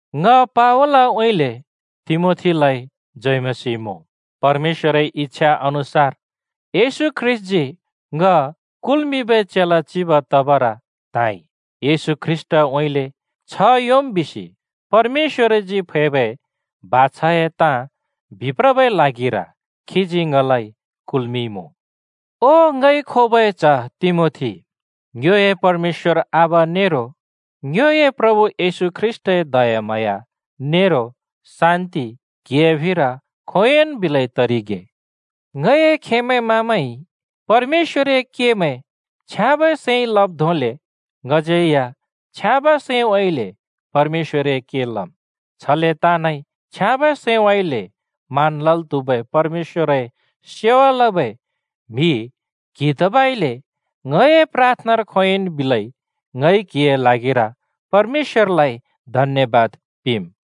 ङ पावलउँइँले तिमोथीलाइ जय मसीह मुँ। परमेश्‍वरए इच्छा अनुसार येशू ख्रीष्‍टजी ङ कुल्मिंबै चेला चिब तबर त्हाँइ। येशू ख्रीष्‍टउँइँले छ्ह योंम् बिसि परमेश्‍वरजी फैबै बाछाए ताँ बिप्रबै ल्हागिर खीजी ङलाइ कुलइमुँ। ओ ङइ खोबै च्ह तिमोथी, ङ्योए परमेश्‍वर आबा नेरो ङ्योए प्रभु येशू ख्रीष्‍टए दयाम्हाँया नेरो शान्ति क्हिए फिर खोंयोंन् बिलै तरिगे। ङए खेमैं-मामैंइ परमेश्‍वरए केमैं छ्याँबै सैंइ लब् धोंले, ङज्यै या छ्याँबै सैंउँइँले परमेश्‍वरए के लम्, छले ताँनइ छ्याँबै सैंउँइँले मान लल् त्हुबै परमेश्‍वरए सेवा लबै म्हि क्हि तबइले ङए प्राथनार खोंयोंइन् बिलै ङइ क्हिए ल्हागिर परमेश्‍वरलाइ धन्‍यबाद पिंम्।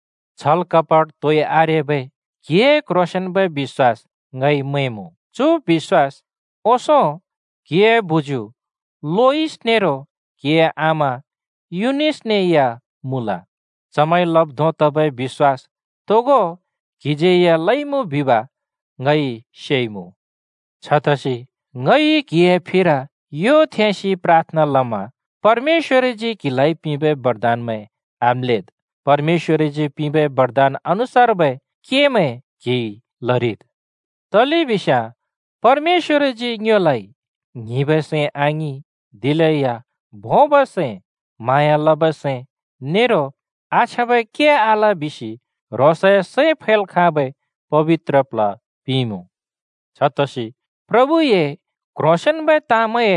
छल कपट तोइ आरेबै क्हिए क्ह्रोंसेंन्बै बिश्‍वास ङइ मैंमुँ। चु बिश्‍वास ओंसों क्‍हिए बुज्‍यू लोइस नेरो क्‍हिए आमा युनिसने या मुँल। चमैंइ लब् धों तबै बिश्‍वास तोगो क्‍हिज्यै या लइमुँ बिब ङइ सेइमुँ। छतसि ङइ क्‍हिए फिर यो थेंसि प्राथना लमा, परमेश्‍वरजी क्हिलाइ पिंबै बरदानमैं आम्‍लेद्। परमेश्‍वरजी पिंबै बरदान अनुसार्बै केमैं क्हिइ लरिद्। तलेबिस्याँ परमेश्‍वरजी ङ्योलाइ ङ्हिंबै सैं आङिं, दिलेया भोंबै सैं, म्हाँया लबै सैं नेरो आछ्याँबै के आल बिसि ह्रोंसए सैं फैल् खाँबै पबित्र प्ल्ह पिंइमुँ। छतसि प्रभुए क्ह्रोंसेंन्बै ताँमैंए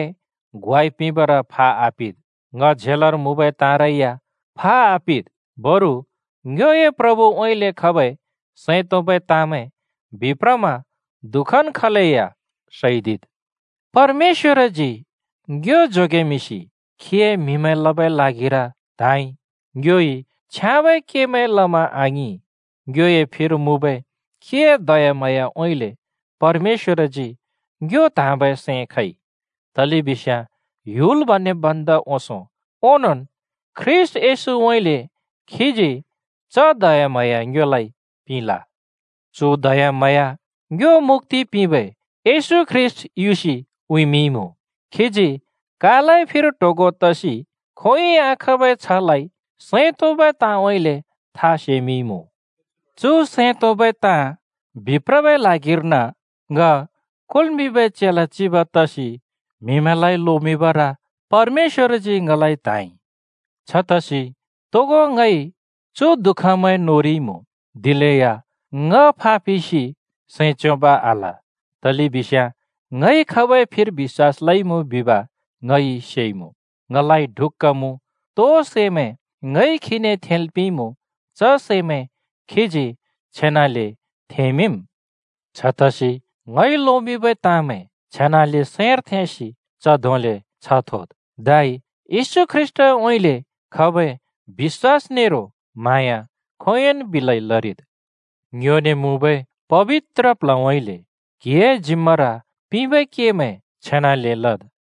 ग्वाइ पिंबर फा आपिद्। ङ झेलर मुँबै ताँरै या फा आपिद्। बरु ङ्योए प्रभुउँइँले खबै सैं तोंबै ताँमैं बिप्रमा दुःखन् खलेया सैदिद्। परमेश्‍वरजी ङ्यो जोगेमिंसि खीए म्‍हिमैं लबै ल्हागिर त्‍हाँइ। ङ्योइ छ्याँबै केमैं लमा आङिं, ङ्योए फिर मुँबै खीए दयाम्हाँयाउँइँले परमेश्‍वरजी ङ्यो त्हाँबै सैं खइ। तलेबिस्याँ ह्‍युल बनेब् भन्दा ओंसों ओंनोंन् ख्रीष्‍ट येशूउँइँले खीजी च दयाम्हाँया ङ्योलाइ पिंल। चु दयाम्हाँया ङ्यो मुक्‍ति पिंबै येशू ख्रीष्‍ट युसि उँइँमिंइँमुँ। खीजी कालए फिर ट्होगों तसि खोंयोंइ आखाँबै छ्हलाइ सैं तोंबै ताँउँइँले था सैमिंइमुँ। चु सैं तोंबै ताँ बिप्रबै ल्हागिर्न ङ कुल्मिंबै चेला चिब तसि म्हिमैंलाइ लोमिंबर परमेश्‍वरजी ङलाइ त्हाँइ। छतसि तोगो ङइ चु दुःखमैं नोरिइमुँ, दिलेया ङ फापिसि सैं च्योंब् आल। तलेबिस्याँ ङइ खाबै फिर बिश्‍वास लइमुँ बिब ङइ सेइमुँ, ङलाइ ढुक्‍का मुँ तो सैमैं ङइ खीने थेंल् पिंइमुँ, च सैमैं खीजी छेनाले थेंमिंम्। छतसि ङइ लोमिंबै ताँमैं छेनाले सैंर थेंसि च धोंले छ्ह थोद्। धै येशू ख्रीष्‍टउँइँले खबै बिश्‍वास नेरो म्हाँया खोंयोंन् बिलै लरिद्। ङ्योने मुँबै पबित्र प्ल्हउँइँले क्‍हिए जिम्‍मार पिंबै केमैं छेनाले लद्।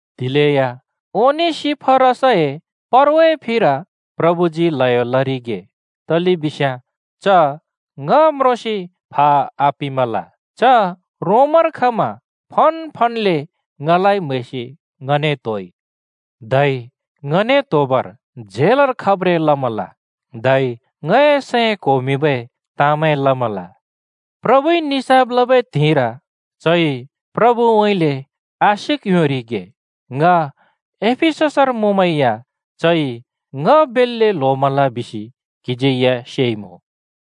दिलेया ओनेसिफरसए परवाए फिर प्रभुजी ल्हयो लरिगे, तलेबिस्याँ च ङ म्रोंसि फा आपिमल। च रोमर खमा फनफनले ङलाइ म्हैसि ङने त्होइ। धै ङने त्होबर झेलर खब्रें लमल धै ङए सैं क्‍होमिंबै ताँमैं लमल। प्रभुइ निसाफ लबै त्हिंइर चइ प्रभुउँइँले आशिक योंरिगे। ङ एफिससर मुँमै या चइ ङ बेल्‍ले ल्होमल बिसि क्‍हिज्यै सेइमुँ।